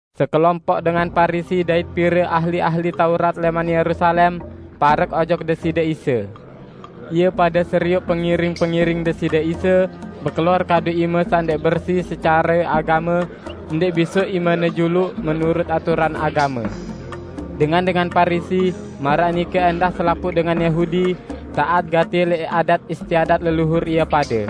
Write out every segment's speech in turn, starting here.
Sekelompoq dengan Parisi dait pire ahli-ahli Taurat lẽman Yerusalem, parek ojok Deside Isa. Ie pade serioq pengiring-pengiring Deside Isa bekelor kadu ime saq ndẽq bersi secare agame, ndẽq bisoq imene juluq, menurut aturan agame. Dengan-dengan Parisi, maraq nike ẽndah selapuq dengan Yahudi, taat gati lẽq adat istiadat leluhur ie pade.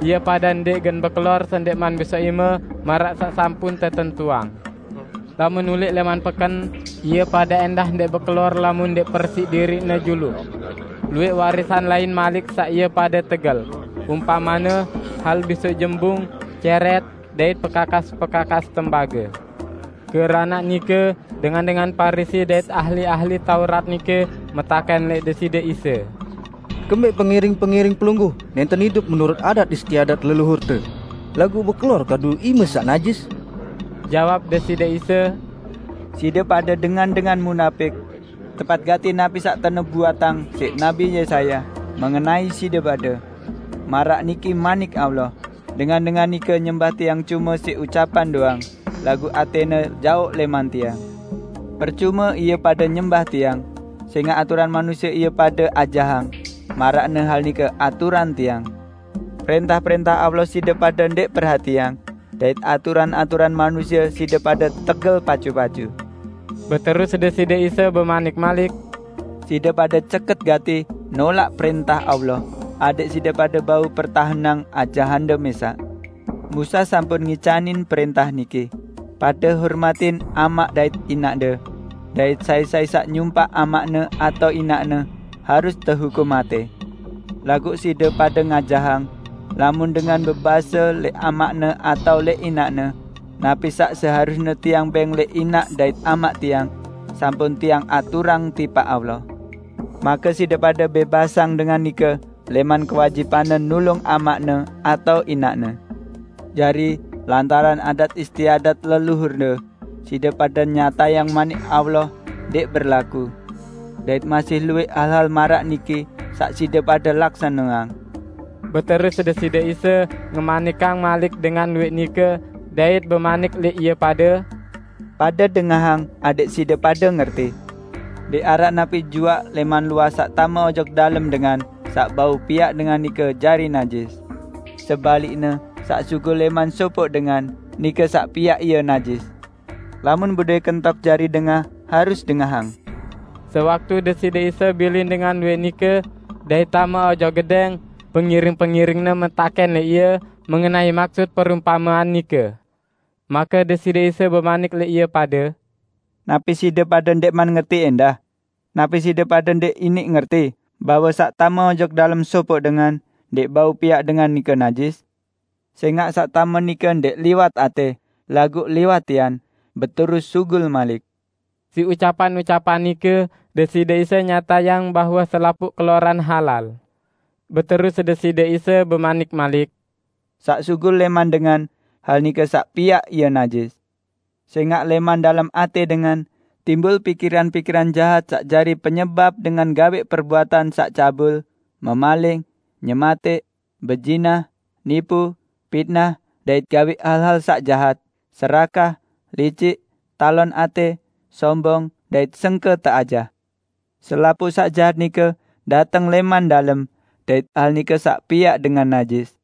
Ie pade ndẽq gen bekelor sendẽqman bisoq ime maraq saq sampun tetentuang. Lamun ulẽq lẽman peken, ie pade ẽndah ndẽq bekelor lamun ndẽq persiq diriqne juluq. Luwẽq warisan lain malik saq ie pade tegel, umpamene hal bisoq jembung, cẽrẽt dait pekakas-pekakas tembage. Keranaq nike dengan-dengan Parisi dait ahli-ahli Taurat nike metakẽn lẽq Deside Isa, "Kembẽq pengiring-pengiring Pelungguh nẽnten idup menurut adat istiadat leluhurte, laguq bekelor kadu ime saq najis?" Jawab Deside Isa, "Side pade dengan-dengan munapik! Tepat gati napi saq tenubuatang siq Nabi Yesaya, mengenai side pade, 'Maraq niki Manik Allah, Dengan-dengan nike nyembah Tiang cume siq ucapan doang, laguq atẽne jaoq lẽman Tiang. Percume ie pade nyembah Tiang, sẽngaq aturan manusie ie pade ajahang, maraqne hal nike aturan Tiang!' Prẽntah-prẽntah Allah side pade ndẽq perhatiang, dait aturan-aturan manusie side pade tegel pacu-pacu." Beterus Deside Isa bemanik malik, "Side pade ceket gati nolaq prẽntah Allah adẽq side pade bau pertahenang ajahande mẽsaq. Musa sampun ngicanin prẽntah niki, 'Pade hormatin amaq dait inaqde!' dait 'Sai-sai saq nyumpaq amaqne atao inaqne, harus tehukum matẽ.' Laguq side pade ngajahang: Lamun dengan bebase lẽq amaqne atao lẽq inaqne, 'Napi saq seharusne tiang bẽng lẽq inaq dait amaq tiang, sampun tiang aturang tipaq Allah,' make side pade bẽbasang dengan nike lẽman kewajibanne nulung amaqne atau inaqne. Jari, lantaran adat istiadat leluhurde, side pade nyatayang Manik Allah ndẽq berlaku. Dait masih luwẽq hal-hal maraq niki saq side pade laksaneang." Beterus Deside Isa ngemanikang malik dengan luwẽq nike, dait bemanik lẽq ie pade, "Pade dengahang adẽq side pade ngerti! Ndẽq araq napi juaq lẽman luah saq tame ojok dalem dengan saq bau piaq dengan nike jari najis. Sebalikne saq sugul lẽman sopoq dengan, nike saq piaq ie najis. [ Lamun bedowẽ kentok jari dengah harus dengahang.]" Sewaktu Deside Isa bilin dengan luwẽq nike, dait tame ojok gedẽng, pengiring-pengiring-Ne metakẽn lẽq Ie mengenai maksut perumpamean nike. Make Deside Isa bemanik lẽq ie pade, "Napi side pade ndẽqman ngerti ẽndah? Napi side pade ndẽq iniq ngerti bahwe saq tame ojok dalem sopoq dengan ndẽq bau piaq dengan nike najis? Sẽngaq saq tame nike ndẽq liwat atẽ, laguq liwat tian, beterus sugul malik." Siq ucapan-ucapan nike Deside Isa nyatayang bahwe selapuq keloran halal. Beterus Deside Isa bemanik malik, "Saq sugul lẽman dengan, hal nike saq piaq ie najis. Sẽngaq lẽman dalem atẽ dengan, timbul pikiran-pikiran jahat saq jari penyebap dengan gawẽq perbuatan saq cabul, memaling, nyematẽq, bezinah, nipu, pitnah, dait gawẽq hal-hal saq jahat, serakah, licik, talon atẽ, sombong dait sengke teajah. Selapuq saq jahat nike dateng lẽman dalem, dait hal nike saq piaq dengan najis."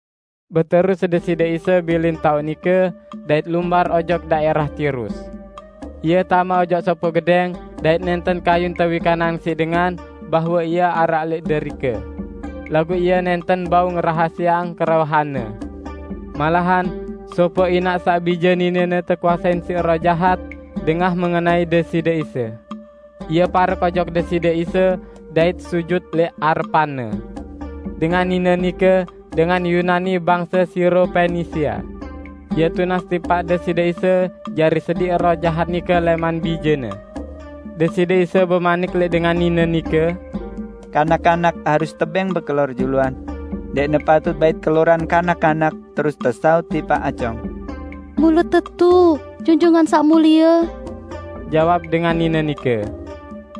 Beterus Deside Isa bilin taoq nike, dait lumbar ojok daẽrah Tirus. Ie tame ojok sopoq gedẽng dait nẽnten kayun tewikanang siq dengan bahwe Ie araq lẽq derike. Laguq Ie nẽnten bau ngerahasieang kerauhan-Ne. Malahan, sopoq inaq saq bije ninene tekuasein siq roh jahat, dengah mengenai Deside Isa. Ie parek ojok Deside Isa dait sujut lẽq arepan-Ne. Dengan nine nike dengan Yunani bangse Siro-Penisia. Ie tunas tipaq Deside Isa jari sediq roh jahat nike lẽman bijene. Deside Isa bemanik lẽq dengan nine nike, "Kanak-kanak harus tebẽng bekelor juluan. Ndẽqne patut bait keloran kanak-kanak terus tesaut tipaq acong." "Mule tetu, Junjungan Saq Mulie," jawab dengan nine nike,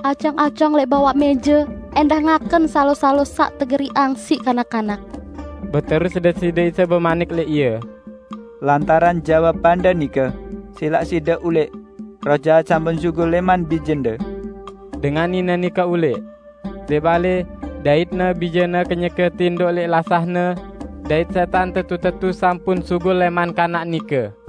"acong-acong lẽq bawaq mẽje ẽndah ngaken salo-salo saq tegeriqang siq kanak-kanak!" Beterus Deside Isa bemanik lẽq ie, "Lantaran jawabande nike, silaq side ulẽq; roh jahat sampun sugul lẽman bijende!" Dengan nine nike ulẽq. Lẽq balẽ, daitne bijene kenyeke tindoq lẽq lasahne, dait sẽtan tetu-tetu sampun sugul lẽman kanak nike.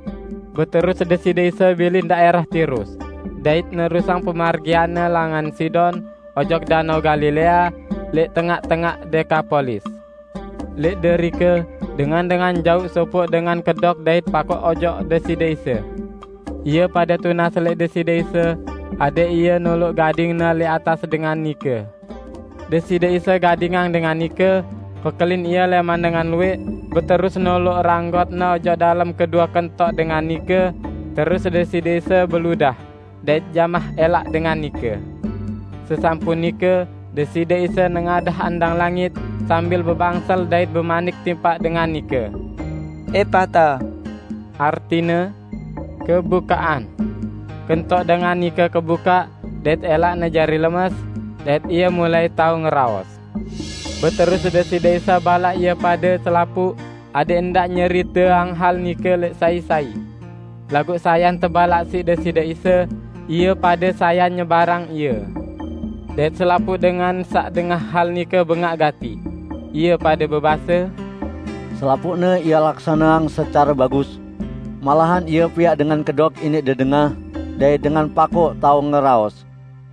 Beterus Deside Isa bilin daẽrah Tirus, dait nerusang pemargian-Ne langan Sidon ojok Danao Galilea, lẽq tengaq-tengaq Dekapolis. Lẽq derike dengan-dengan jauq sopoq dengan kedok dait pakoq ojok Deside Isa. Ie pade tunas lẽq Deside Isa adẽq Ie noloq gading-Ne lẽq atas dengan nike. Deside Isa gadingang dengan nike, pekelin ie lẽman dengan luwẽq beterus noloq ranggot-Ne ojok dalem kedue kentok dengan nike, terus Deside Isa beludah, dait jamah ẽlaq dengan nike. Sesampun nike, Deside Isa nengadah andang langit sambil bebangsel dait bemanik tipaq dengan nike, "Epata!" artine, "Kebukaqan!" Kentok dengan nike kebukaq dait ẽlaqne jari lemes, dait ie mulai tao ngeraos. Beterus Deside Isa balaq ie pade selapuq adẽq ndaq nyeriteang hal nike lẽq sai-sai. Laguq sayan tebalaq siq Deside Isa, ie pade sayan nyebarang ie. Dait selapuq dengan saq dengah hal nike bengaq gati. Ie pade bebase, "Selapuqne Ie laksaneang secare bagus! Malahan Ie piaq dengan kedok iniq dedengah dait dengan pakoq tao ngeraos!"